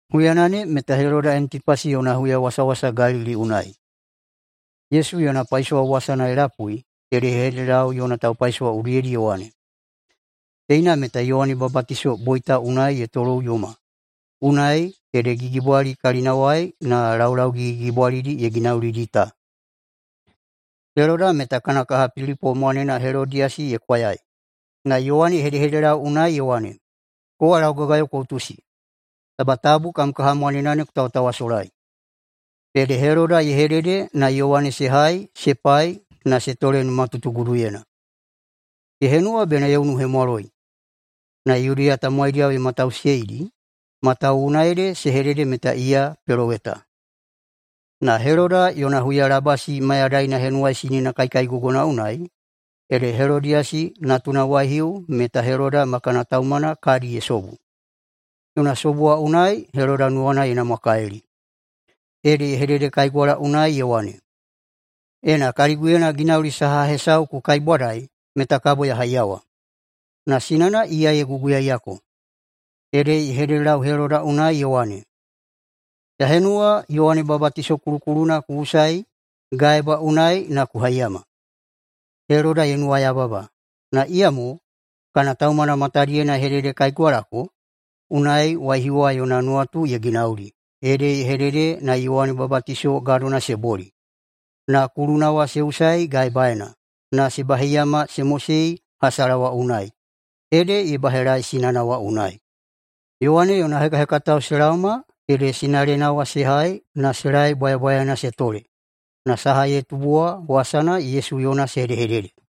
Huyana ne meta Heloda Antipasi yona huyawasawasa Galili unai. Yesu yona paisowa wasana ye lapuidi ede ye hededelau yona taupaisowa udiyedi ye wane, “Teina meta Yowane Babatiso boita unai ye toloꞌuyoma, unai ede gigibwali kalinawai na laulau gigigigibwalidi ye ginaulidi ta.” Heloda meta kana kaha Pilipo mwanena Helodiyasi ye kwayai. Na Yowane ye hedehededelau unai ye wane, “Kowa laugagayo ku utusi, taba tabu kam kaha mwanena ne ku tawatawasolai!” Ede Heloda ye hedede na Yowane se hai se pai na se tole numatutuguduyena. Ye henuwa bena ye unuhemwaloi, na Yudeya tamowaidiyao ye matausiyeidi, matawuwuna ede se hedede meta iya peloweta. Na Heloda yona huyalabasi mayadaina henuwaisinina kaikaigogona unai, ede Helodiyasi natuna waihiu meta Heloda ma kana taumana kadi ye sobu. Yona sobu wa unai Heloda nuwana ye namwakalili ede ye hededekaigwala unai ye wane, “Ena kaliguyena ginauli saha hesau ku kaibwadai meta kabo ya haiyawa.” Na sinana iya ye guguyaiyako, ede ye hededelau Heloda unai ye wane, “Ya henuwa Yowane Babatiso kulukuluna ku usai gaeba unai na ku haiyama.” Heloda ye nuwayababa, na iyamo kana taumana matadiyena ye hededekaigwalako. Unai waihiu wa yona nuwatu ye ginauli ede ye hedede na Yowane Babatiso gadona se boli, na kuluna wa se usai gaebaena na se baheiyama se mosei hasala wa unai, ede ye bahelaei sinana wa unai. Yowane yona hekahekatao se laoma ede sinalena wa se hai na se laei bwayabwayaena se tole. Na saha ye tubu wa wasana Yesu yona se hedehedede.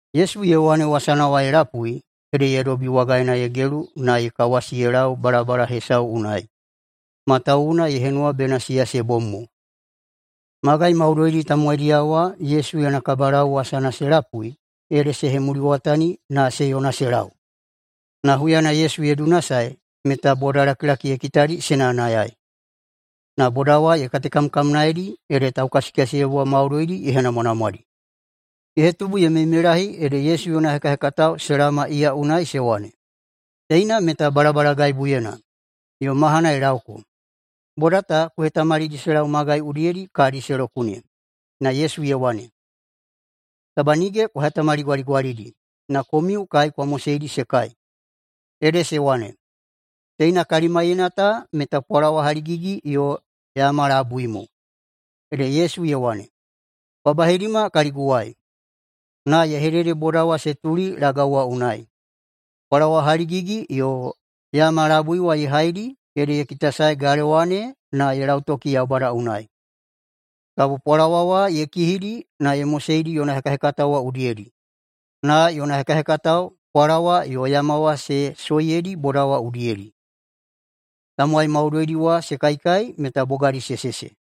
Yesu Yowane wasana wa ye lapui ede ye dobi wagaena ye gelu na ye kawasi ye lau balabala hesau unai, matawuwuna ye henuwa bena siya se bom mo. Magai maudoidi tamowaidiyao wa Yesu yona kabalau wasana se lapui ede se hemuliwatani na se yona se lau. Na huyana Yesu ye dunasae meta bodalakilaki ye kitadi se nayanayaei. Na boda wa ye katekamkamnaedi ede taukasikasiyebwa maudoidi ye henamwanamwadi. Ye hetubu ye meimeilahi ede Yesu yona hekahekatao se laoma iya unai se wane, “Teina meta balabalagaibuyena, yo mahana ye laoko. Boda ta ku hetamalidi se lau magai udiyedi kadi se lokune.” Na Yesu ye wane, “Taba nige kwa hetamaligwaligwalidi, na komiu kai kwa moseidi se kai.” Ede se wane, “Teina kalimaiyena ta meta pwalawa haligigi yo yama labui mo.” Ede Yesu ye wane, “Kwa baheidima kaliguwai.” Na ye hedede boda wa se tuli lagau wa unai. Pwalawa haligigi yo yama labui wa ye haidi ede ye kitasae galewa ne na ye lautoki Yaubada unai, kabo pwalawa wa ye kihidi na ye moseidi yona hekahekatao wa udiyedi, na yona hekahekatao pwalawa yo yama wa se soiyedi boda wa udiyedi. Tamowai maudoidi wa se kaikai meta bogadi se sese.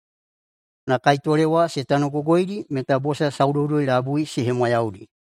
Na kaitole wa se tanogogoidi meta bosa saudoudoi-labui se hemwayaudi.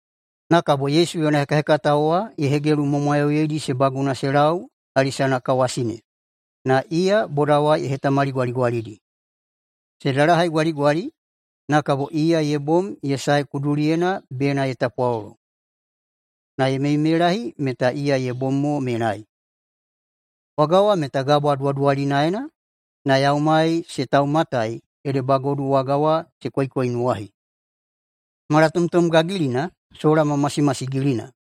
Na kabo Yesu yona hekahekatao wa ye hegelumwamwayauyeidi se baguna se lau hali sanakawasi ne, na iya boda wa ye hetamaligwaligwalidi. Se dalahaigwaligwali, na kabo iya ye bom ye sae kuduliyena bena ye tapwalolo. Na ye meimeilahi meta iya ye bom mo menai. Waga wa meta gabwa duwaduwalinaena na yaumai se taumatai ede bagodu waga wa se koikoinuwahi. Malatomtom gagilina sola ma masimasigilina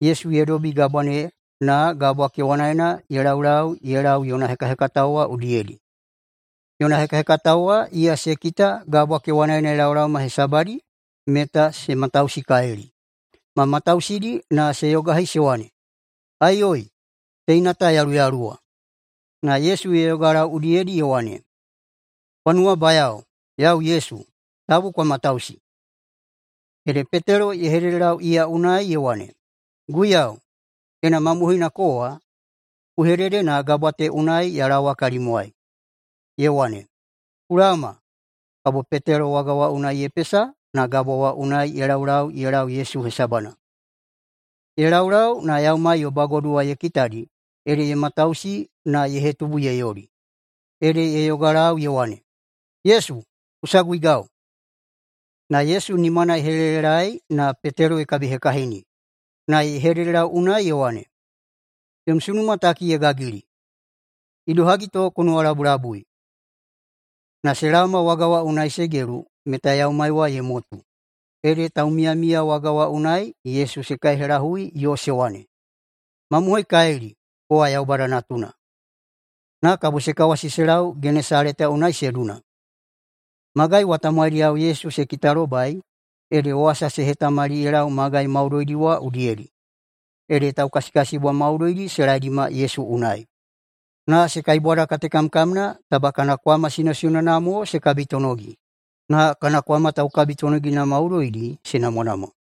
Yesu ye dobi gabwa ne, na gabwa kewanaena ye laulau ye lau yona hekahekatao wa udiyedi. Yona hekahekatao wa iya se kita gabwa kewanaena ye laolaoma hesabadi meta se matausikalili, ma matausidi na se yogahi se wane, “Aiyoi! Teina ta yaluyaluwa.” Na Yesu ye yogalau udiyedi ye wane, “Kwa nuwabayao! Yau Yesu! Tabu kwa matausi!” Ede Petelo ye hededelau iya unai ye wane, “Guiyau, ena mamohoina kowa, ku hedede na gabwa ta unai ya laowa kalimwai.” Ye wane, “Ku laoma!” Kabo Petelo waga wa unai ye pesa na gabwa wa unai ye laulau ye lau Yesu hesabana. Ye laulau na yaumai yo bagodu wa ye kitadi ede ye matausi na ye hetubu ye yoli, ede ye yogalau ye wane, “Yesu, ku saguigau!” Na Yesu nimana ye helelelaei na Petelo ye kabihekahini, na ye hededelau unai ye wane, “Yom sunuma taki ye gagili! Idohagi to ku nuwalabulabui?” Na se laoma waga wa unai se gelu meta yaumai wa ye motu. Ede taumiyamiya waga wa unai Yesu se kaihelahui yo se wane, “Mamohoikalili, kowa Yaubada Natuna!” Na kabo se kawasi se lau Genesaleta unai se duna. Magai wa tamowaidiyao Yesu se kitalobai ede wasa se hetamali ye lau magai maudoidi wa udiyedi. Ede taukasikasiyebwa maudoidi se laedima Yesu unai, na se kaibwadakatekamkamna taba kana kwama sinosinona mo se kabitonogi. Na kana kwama taukabitonogina maudoidi se namwanamwa.